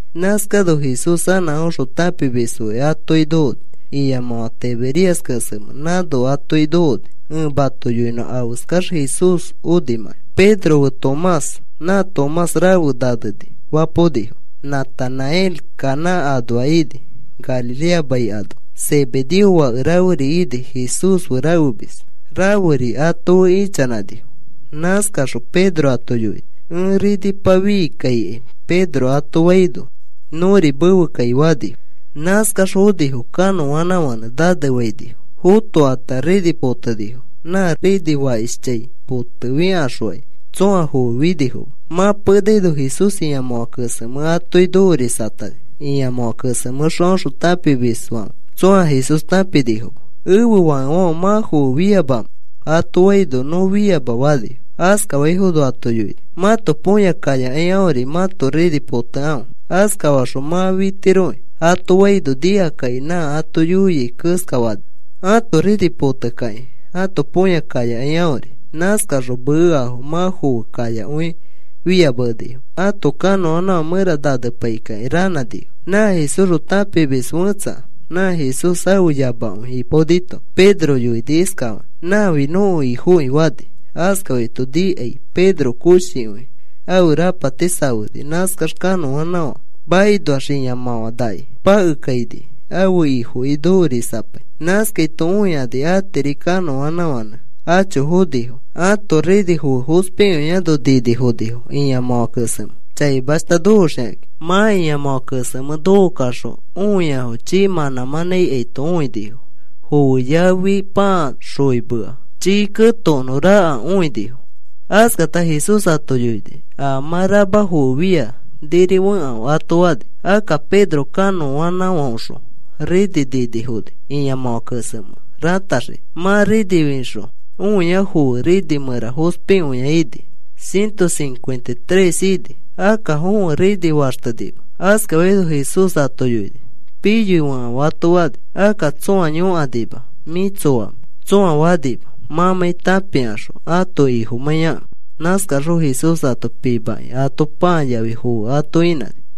Nãskano Jesús anã aõxõ tãpimisfoki atoki nokoni. Ĩamãfã Tiberias kesemẽ nãno atoki nokoni. Ẽ mato yoinõ afeskax Jesús onimãki. Pedro fe Tomás (nã Tomás “Rafe Naneni” fapaonifo), Natanael Caná anoa ini Galilea mai anoa, Zebedeo fake raferi ini, Jesús fe rafemis raferi ato fe ichanãnifo. Nãskaxõ Pedro ato yoini: “Ẽ rinipa fii kaikai,” Pedro ato faino, “Nõri mefe kai,” fanifo. Nãskax fonifo kanõanãfãnẽ nanefainifo. Fõkata rini potenifo nã rini fakishchãi potefikaxokai tsõa foe finifoma. Mã penaino Jesús ĩamãfã kesemẽ atoki nokorisatani. Ĩamãfã kesemẽxõ aõxõ tãpimisfãfe tsõa Jesús tãpinifoma. “¿Ẽfe fakefãfe, mã foe fiamamẽ?” ato faino, “Nõ fiama,” fanifo. Askafaifono ato yoini: “Mãto põya kayakai aõri mãto rini potekãfe. Askafaxõ mã fitiroki,” ato faino nikakakĩ nã ato yoiai keskafanifo ãto rini potekakĩ ãto põya kayakai aõri. Nãskaxõ meafo mã foe kayakõi fia menifo. Ato kanõanãfã mẽra nanepaikakĩ ranãnifo. Nã Jesúsxõ tãpimis fẽtsa nã Jesús ãfe yamakõi ipaonito Pedro yoini iskafakĩ: “¡Nãfi nõko Ifoki!” fani. Askafaito nikai Pedro koshikõi ãfe rapati safeni nãskax kanõanãfã makinoax ĩamãfãnaki pakekaini ãfe Ifoki nokorisapai. Nãskaito õikani atiri kanõanãfãnẽ acho fonifo. Ãto rini foe fospikõiano ninifonifo ĩamãfã kesemẽ chaimashta nokoxikakĩ. Mã ĩamãfã kesemẽ nokokaxõ õiafo chii mãnã mãnã ikaito õinifo. Foe yafi pãa xoimea chii ketokonõ raka õinifo. Askata Jesús ato yoini: “A mã rama foe fia niri fekãfe,” ato fani. Akka Pedro kanõanãfãoxõ rini ninifoni ĩamãfã kesemẽ rataxiki. Mã rini fixõ õia foe rini mẽra fospikõia õini. Ciento cincuenta y tres ini. Akka fõe rini faxtenima. Askaifono Jesús ato yoini: “Piyoi fekãfe,” ato fani. Akka tsõa yõkanima: “¿Mĩ tsoamẽ?” tsõa fanima mãmãi tãpikaxõ ãto Ifomãiyakẽ. Nãskaxõ Jesús ato pimakĩ ato pãa yafi foe ato inãni.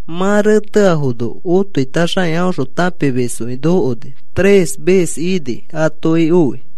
Mã reteafono otoitaxakĩ aõxõ tãpimisfoki nokoni. Tres ves ini atoki oi.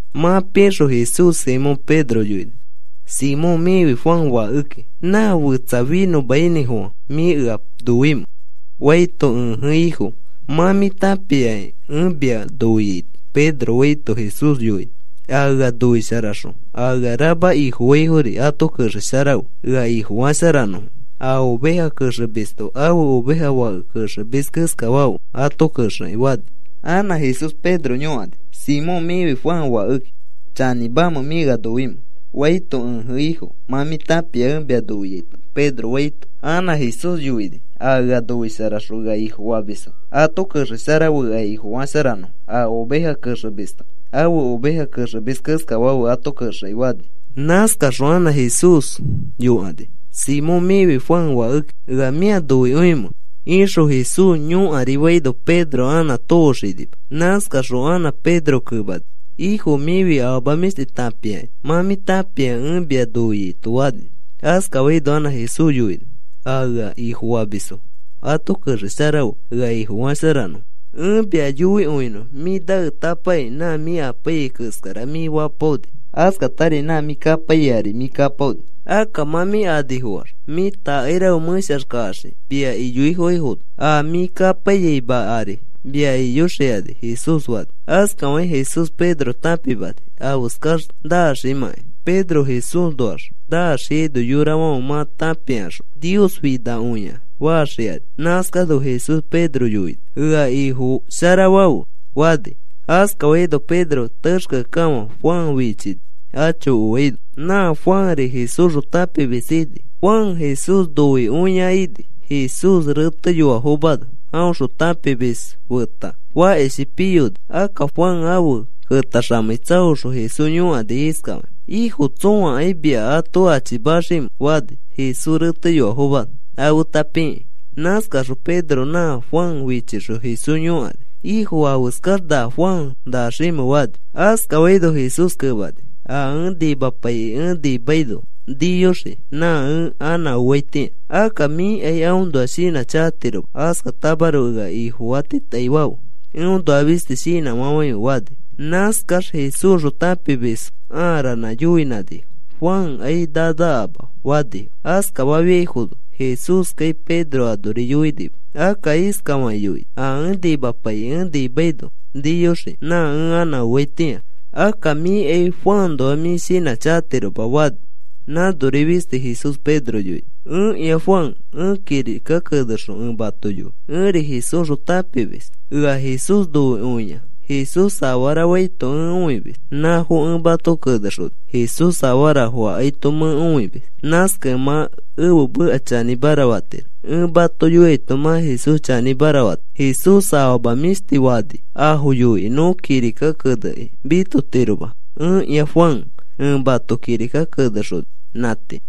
Mã pixõ Jesús Simón Pedro yoini: “Simón mĩfi Juan fakeki. ¿Na fetsa finõmainĩfofã mĩ ea noimẽ?” faito, “Ẽje Ifo. Mã mĩ tãpiaki ẽ mia noiaito,” Pedro faito, Jesús yoini: “A ea noisharaxõ a ea rama Ifofaifori ato kexesharafe ea Ifosharafanõfo. A oveja kexemisto ãfe oveja fake kexemis keskafafe ato kexekĩ,” fani. Anã Jesús Pedro yõkani: “Simón, mĩfi Juan fakeki. ¿Chanĩmamẽ mĩ ea noimẽ?” faito, “Ẽje, Ifo. Mã mĩ tãpia ẽ mia noiaito” Pedro faito, anã Jesús yoini: “A ea noisharaxõ ea Ifofamisfo ato kexesharafe ea Ifosharafanõfo. A oveja kexemisto ãfe oveja kexemis keskafafe ato kexekĩ,” fani. Nãskaxõ anã Jesús yõkani: “Simón, mĩfi Juan fakeki. ¿Ea mĩa noikõimẽ?” ixõ Jesús yõkari faino Pedro anã tooxinima. Nãskaxõ anã Pedro kemani: “Ifo, mĩfi afama mĩshti tãpiaki. Mã mĩ tãpia ẽ mia noiaito,” fani. Askafaino anã Jesús yoini: “A ea Ifofamisfo ato kexesharafe ea Ifofasharanõfo. Ẽ mia yoikõinõ. Mĩ naetapakĩ nã mĩ apaiyai keskara mĩ fapaoni. Askatari nã mĩ kapaiyai ari mĩ kapaoni. Akka mã mĩ anifoax mĩ takairafe mẽshax kaxii mia iyoaifono a mĩ kapaiyamai ari mia iyoxikani,” Jesús fani. Askafakĩ Jesús Pedro tãpimani afeskax naximãkai. Pedro Jesúsnoax naxiaino yorafãfe mã tãpikaxõ, “Nios finakõia,” faxikani. Nãskano Jesús Pedro yoini: “Ea Ifosharafafe,” fani. Askafaino Pedro texkeakekafã Juan fichini acho oaino. (Nã Juanri Jesúsxõ tãpimis ini, Juan Jesús noikõia ini. Jesús reteyoafomano aõxõ tãpimisfo feta fakishi piyoni. Akka Juan afe ketaxamei tsaoxõ Jesús yõkani iskafakĩ: “¿Ifo, tsõakai mia ato achimaximẽ?” fani Jesús reteyoafomano afeta pikĩ.) Nãskaxõ Pedro nã Juan fichixõ Jesús yõkani: “¿Ifo, afeskax na Juan naximẽ?” fani. Askafaino Jesús kemani: “A ẽ nimapaikĩ ẽ nimaino niyoxii nã ẽ anã oaitĩa. Akka mĩkai aõnoa shinãchakatiroma. Askatamaroko ea Ifofatitaifafe. Eõnoa fisti shinãfafãife,” fani. Nãskax Jesúsxõ tãpimisfo ãa ranã yoinãnifo: “Juankai nanakama,” fanifo. Askafafiaifono Jesúskai Pedro anori yoinima. Akka iskafakĩ yoini: “A ẽ nimapaikĩ ẽ nimaino niyoxii nã ẽ anã oaitĩa. Akka mĩkai Juanõnoa mĩ shinãchakatiroma,” fani. Nãnori fisti Jesús Pedro yoini. Ẽkĩa Juan ẽ kirika kenexõ ẽ mato yoi. Ẽri Jesúsxõ tãpimis. Ea Jesús noikõia. Jesús afarafo faito ẽ õimis. Nãfo ẽ mato kenexoni. Jesús afarafo akaito mẽ õimis. Nãskakẽ mã ẽfe meka chanĩmara fatiro. Ẽ mato yoiaito mã Jesús chanĩmara fatiro. Jesús afama mĩshti fani afo yoikĩ nõ kirika kenekĩ mitotiroma. Ẽkĩa Juan ẽ mato kirika kenexoni. Nã tii.